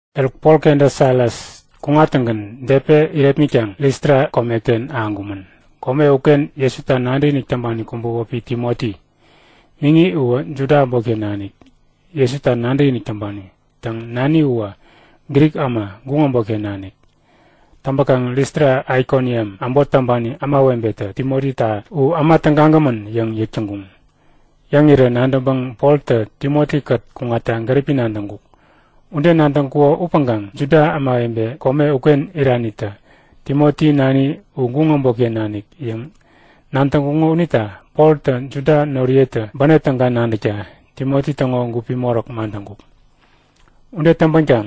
Eruk Pol kenta Silas kuŋattäŋgän Depe irepmitkaŋ Listra komeken ahäŋkumän. Kome uken Jesuta nadäkinik täŋpani kubä wäpi Timoti. Miŋi uwä Juda äbotken nanik Jesuta nadäkinik täŋpani. Täŋ, naniwä Grik äma, guŋ äbotken nanik. Täŋpäkaŋ Listra Aikoniam äbot täŋpani ämawebetä Timotita u äma tägagämän yäŋ yäk täŋkuŋ. Yäŋirä nadäŋpäŋ Poltä Timoti-kät kuŋatta gäripi nadäŋkuk. Ude nadäŋkuko upäŋkaŋ Juda ämawebe kome uken iranitä Timoti nani u guŋ äbotken nanik yäŋ nadäŋkuŋo unita Poltä Juda noriyetä bänep täga nadäkta Timoti täŋo gupi moräk madäŋkuk. Ude täŋpänkaŋ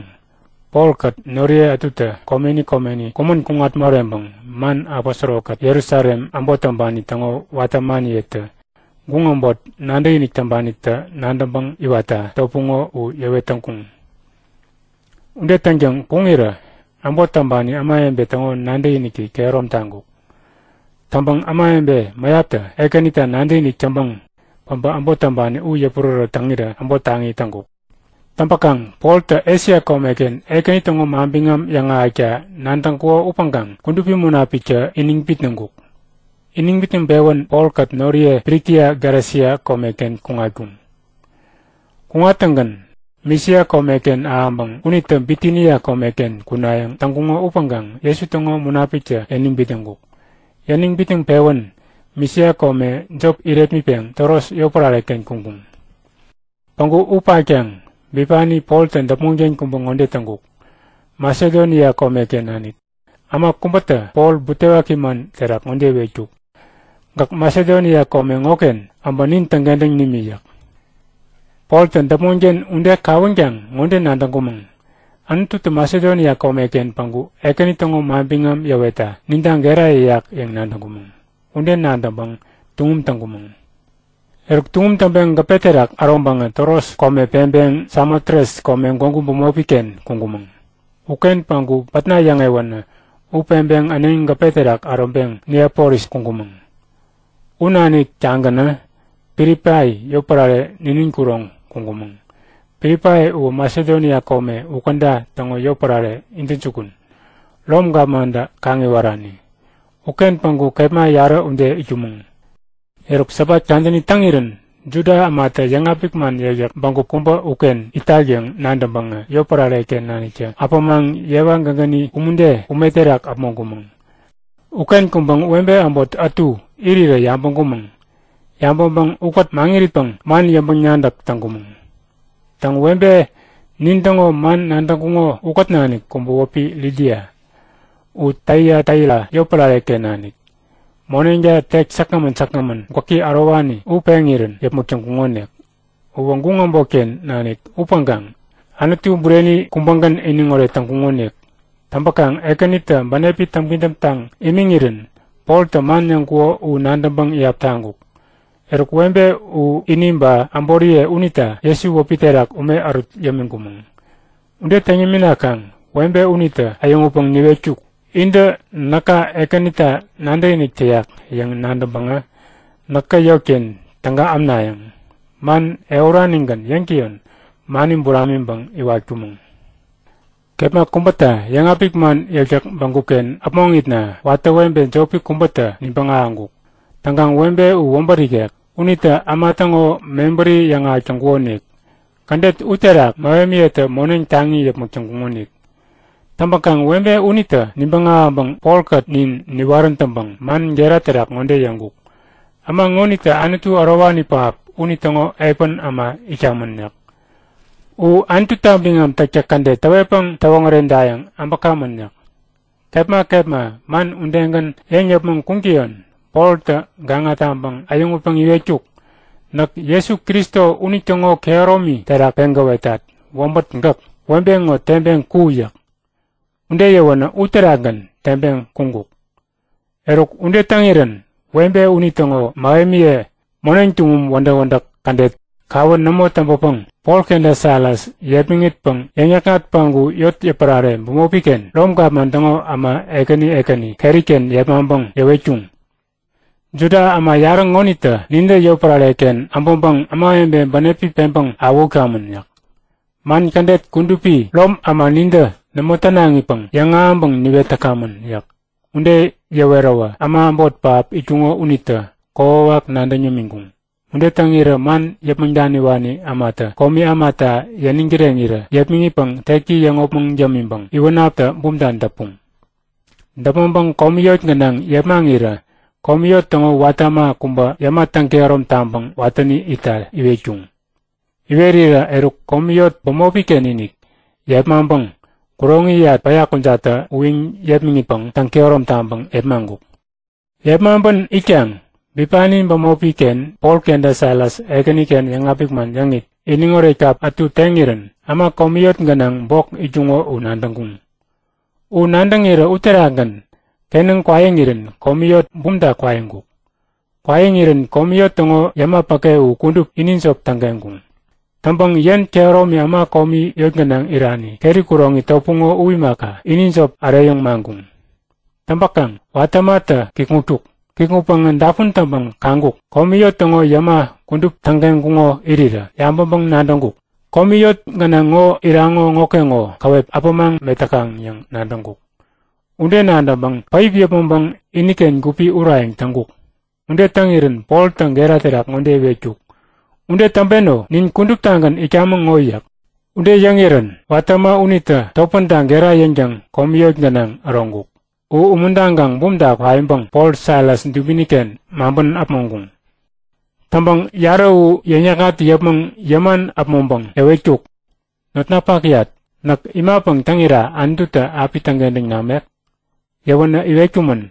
Polkät noriye ätutä komeni komeni kumän kuŋat moreŋpäŋ man aposoro-kät Jerusalem äbot täŋpani täŋo watä ämaniyetä guŋ äbot nadäkinik täŋpanitä nadäŋpäŋ iwatta topuŋo, u yäwet täŋkuŋ. Ude täŋtäŋ kuŋirä äbot täŋpani ämawebe täŋo nadäkiniki kehärom taŋkuk. Täŋpäŋ ämawebe mäyaptä Ekänita nadäkinik täŋpäŋ päbä äbot täŋpani u yäpurärät täŋirä äbot taŋi täŋkuk. Täŋpäkaŋ Poltä Esia komeken Ekäni täŋo manbiŋam yäŋahäkta nadäŋkuko upäŋkaŋ Kudupi Munapiktä iniŋ bitnäŋkuk. Iniŋ bitnäŋpewän Polkät noriye Frikia Galesia komeken kuŋatkuŋ. Kuŋattäŋgän Misia komeken ahäŋpäŋ unitä Bitinia komeken kunayäŋ täŋkuŋo upäŋkaŋ Jesu täŋo Munapiktä yäniŋ bitnäŋkuk. Yäniŋ bitnäŋpewän Misia kome jop irepmitpeŋ Troas yotpärare-ken kuŋkuŋ. Päŋku u patkaŋ bipani Poltä däpmonken kubä ŋode täŋkuk; Masedonia komeken nanik äma kubätä Pol butewaki man terak ŋode iwetkuk; Gäk Masedonia kome ŋoken äbä nin täŋkentäŋ nimi yäk. Poltä däpmonken ude kawänkaŋ ŋode nadäŋkumäŋ; Anututä Masedonia komeken päŋku Ekäni täŋo manbiŋam yäwetta ninta gera yäyak yäŋ nadäŋkumäŋ. Ude nadäŋpäŋ tuŋum täŋkumäŋ. Eruk tuŋum täŋpeŋ gäpe terak äroŋpäŋä Troas kome peŋpeŋ Samotres kome gwägu bämopi-ken kuŋkumäŋ. Uken päŋku pätna yäŋewänä u peŋpeŋ äneŋi gäpe terak äroŋpeŋ Neapolis kuŋkumäŋ. U nanik-tagänä Pilipai yotpärare ninin kuroŋ kuŋkumäŋ. Pilipai uwä Masedonia kome u käda täŋo yotpärare intäjukun, Rom gapmantä kaŋ-iwarani. Uken päŋku kepma yarä ude itkumäŋ. Eruk Sabat kadäni täŋirän Juda ämatä yäŋapik man yäkyäk bägup kubä uken itak yäŋ nadäŋpäŋä yotpärare-ken naniktä äpämaŋ yewa gägäni umude ume terak äpmoŋkumäŋ. Uken kuŋpäŋ webe äbot ätu irirä yabäŋkumäŋ. Yabäŋpäŋ ukät mäŋiritpäŋ man yäŋpäŋ-nadäk täŋkumäŋ. Täŋ, webe nintäŋo man nadäŋkuŋo ukät nanik kubä wäpi Lidia. U Taiataira yotpärare-ken nanik. Moneŋta tek säkgämän säkgämän gwäki ärowani u peŋirän yäpmäk täŋkuŋonik. Uwä guŋ äbotken nanik upäŋkaŋ Anutu bureni kubägän iniŋoret täŋkukonik. Täŋpäkaŋ Ekänitä bänepi täŋpidäm taŋ imiŋirän Poltä man yäŋkuko u nadäŋpäŋ iyap täŋkuk. Eruk webe u ini ba äboriye unita Jesu wäpi terak ume ärut yämiŋkumäŋ. Ude täŋ yäminakaŋ webe unitä äyäŋutpäŋ niwetkuk; Intä näka Ekänita nadäkinik täyak yäŋ nadäŋpäŋä näkä yotken täga ämnayäŋ? Man ehuranigän yäŋtäyon mani buramiŋpäŋ iwatkumäŋ. Kepma kubäta yäŋapik man yäkyäk bägup-ken äpmoŋitna watä webe jopi kubätä nibäŋ ahäŋkuk. Täŋkaŋ webe u wäbät ikek. Unitä äma täŋo mebäri yäŋahäk täŋkukonik. Kädet u terak mähemiyetä moneŋ taŋi yäpmäk täŋkuŋonik. Täŋpäkaŋ webe unitä nibäŋ ahäŋpäŋ Polkät nin niwarän täŋpäŋ man gera terak ŋode yäŋkuk; Äma ŋonitä Anutu ärowani pähap unitäŋo epän äma itkamän yäk. U Anututa biŋam täktäk kädet täwetpäŋ täwoŋäredayäŋ äbäkamän yäk. Kepma kepma man udegän yäŋ yäpmäŋ kuŋtäyon Poltä gaŋa taŋpäŋ äyäŋutpäŋ iwetkuk; Näk Jesu Kristo unitäŋo kehäromi terak peŋ gäwetat; Wäbät, gäk webe ŋo teŋpeŋ ku! yäk. Ude yäwänä uterakgän teŋpeŋ kuŋkuk. Eruk ude täŋirän webe unitäŋo mähemiye moneŋ tuŋum wädäk-wädäk kädet kawä nämo täŋpäpäŋ Pol kenta Silas yepmäŋitpäŋ yäŋ-yäkŋat päŋku yotpärare bämopi-ken Rom gapman täŋo äma ekäni ekäni keri-ken yepmaŋpäŋ yäwetkuŋ; Juda äma yarä ŋonitä nintä yotpärare-ken äbäŋpäŋ ämawebe bänepi peŋ awähutkamän yäk. Man kädet kudupi Rom äma nintä nämo tänaŋipäŋ yäŋahäŋpäŋ niwetkamän yäk. Ude yäweräwä äma äbot pähap itkuŋo unitä kokwawak nadäŋ yämiŋkuŋ. Ude täŋirä man yäpmäŋ daniwani ämatä komi ämata yäniŋ kireŋirä yepmäŋitpäŋ teki yäŋopmäŋ yämiŋpäŋ iwänaptä bumta däpuŋ. Däpmäŋpäŋ komi yot gänaŋ yepmaŋirä komi yot täŋo watä äma kubä yäma täŋkehärom taŋpäŋ watäni itta iwetkuŋ. Iwerirä eruk komi yot bämopi-ken-inik yepmaŋpäŋ kuroŋiyat päya kujattä uyiŋ-yepmäŋitpäŋ täŋkehärom taŋpäŋ yepmaŋkuk. Yepmaŋpän itkaŋ bipani bämopi-ken Pol kenta Silas Ekäniken yäŋapik man yäŋit, iniŋoret kap ätu teŋirän äma komi yot gänaŋ bok itkuŋo u nadäŋkuŋ. U nadäŋirä uterakgän kenäŋ kwaiŋirän komi yot bumta kwaiŋkuk. Kwaiŋirän komi yot täŋo yäma päke u kudup ini jop tägeŋkuŋ. Täŋpäŋ yen kehäromi äma komi yot gänaŋ irani keri kuroŋi topuŋo u imaka, ini jop äreyäŋ maŋkuŋ. Täŋpäkaŋ watä ämatä kikŋutkuk. Kiŋutpäŋä dapun täŋpäŋ kaŋkuk; Komi yot täŋo yäma kudup tägeŋkuŋo irirä. Yabäŋpäŋ-nadäŋkuk; Komi yot gänaŋ ŋo iraŋo ŋokeŋo käwep äpämaŋ metäkaŋ yäŋ nadäŋkuk. Ude nadäŋpäŋ päip yäpmäŋpäŋ iniken gupi urayäŋ täŋkuk. Ude täŋirän Poltä gera terak ŋode iwetkuk; Ude täŋpeno! Nin kuduptagän itkamäŋ ŋo yäk. Ude yäŋirän watä äma unitä topänta gera yäŋtäŋ komi yot gänaŋ äroŋkuk. U umuntaŋkaŋ bumta kwaiŋpäŋ Pol Silas dubini-ken maŋpän äpmoŋkuŋ. Täŋpäŋ yarä u yäŋ-yäkŋat yäpmäŋ yäman äpmoŋpäŋ yäwetkuk; Notnapakyat, näk imapäŋ täŋira Anututä api täŋkentäŋ namek? Yäwänä iwetkumän;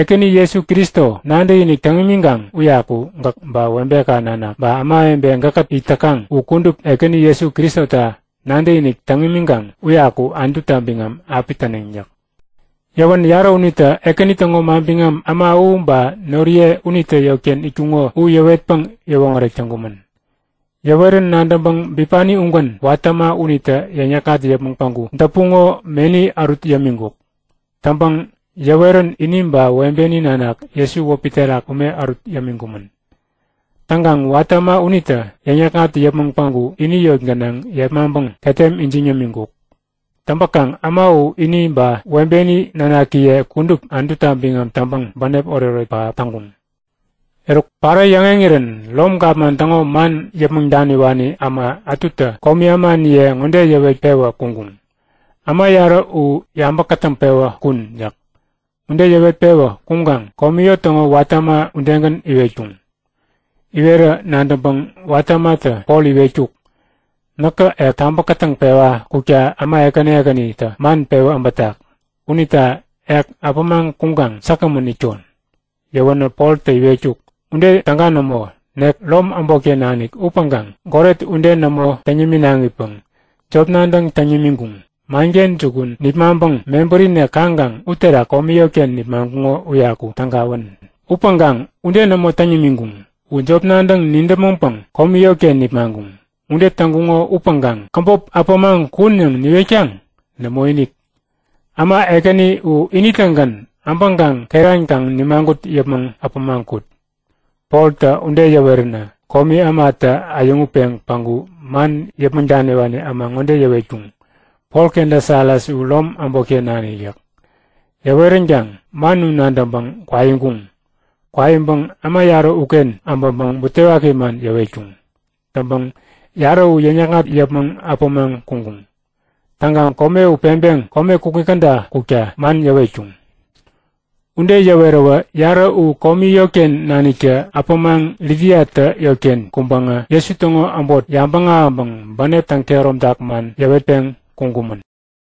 Ekäni Jesu Kristo nadäkinik täŋ imikaŋ uyaku gäk ba webeka nanak ba ämawebe gäkkät it täkaŋ u kudup Ekäni Jesu Kristota nadäkinik täŋ imiŋkaŋ uyaku Anututa biŋam api täneŋ yäk. Yäwän yarä unitä Ekäni täŋo manbiŋam äma u ba noriye unitä yotken itkuŋo u yäwetpäŋ yäwoŋärek täŋkumän. Yäwerän nadäŋpäŋ bipani ugän watä äma unitä yäŋ-yäkŋat yäpmäŋ päŋku däpuŋo meni ärut yämiŋkuk. Täŋpäŋ yäwerän ini ba webeni nanak Jesu wäpi terak ume ärut yämiŋkumän. Täŋkaŋ watä äma unitä yäŋ-yäkŋat yäpmäŋ päŋku ini yot gänaŋ yepmaŋpäŋ ketem ijiŋ yämiŋkuk. Täŋpäkaŋ äma u ini ba webeni nanakiye kudup Anututa biŋam täŋpäŋ bänep oretoret pähap täŋkuŋ. Eruk parä yäŋeŋirän Rom gapman täŋo man yäpmäŋ daniwani äma ätutä komi ämaniye ŋode yäwet-pewä kuŋkuŋ; Äma yarä u yabä kätäŋpewä kun! yäk. Ude yäwet-pewä kuŋkaŋ komi yot täŋo watä äma udegän iwetkuŋ. Iwerä nadäŋpäŋ watä ämatä Pol iwetkuk; Näkä ek tabä kätäŋpewa kukta äma ekäni ekänitä man pewä äbätak. Unita ek äpämaŋ kuŋkaŋ säkgämän itkon. Yäwänä Poltä iwetkuk; Ude täga nämo! Nek Rom äbotken nanik upäŋkaŋ goret ude nämo täŋ niminaŋipäŋ jop nadäŋ täŋ nimiŋkuŋ. Manken jukun nipmaŋpäŋ mebärinek kaŋkaŋ uterak komi yotken nipmaŋkuŋo uyaku tägawän! Upäŋkaŋ ude nämo täŋ nimiŋkuŋ. U jop nadäŋ nidäpmäŋpäŋ komi yotken nipmaŋkuŋ. Ude täŋkuŋo upäŋkaŋ käbop äpämaŋ kun yäŋ niwetkaŋ? Nämoinik! Äma ekäni u ini-tägän äbäŋkaŋ keran kaŋ nimagut yäpmäŋ äpämaŋ kut. Poltä ude yäweränä komi ämatä äyäŋutpeŋ päŋku man yäpmäŋ daniwani äma ŋode yäwetkuŋ; Pol kenta Silas u Rom äbotken nanik yäk. Yäweränkaŋ man u nadäŋpäŋ kwaiŋkuŋ. Kwaiŋpäŋ äma yarä uken äbäŋpäŋ butewaki man yäwetkuŋ. Täŋpäŋ yarä u yäŋ-yäkŋat yäpmäŋ äpämaŋ kuŋkuŋ. Täŋkaŋ kome u peŋpeŋ kome kukŋi käda kukta man yäwetkuŋ. Ude yäweräwä yarä u komi yotken naniktä äpämaŋ Lidiatä yotken kuŋpäŋä Jesu täŋo äbot yabäŋ ahäŋpäŋ bänep täŋ-kehäromtak man yäwetpeŋ kuŋkumän.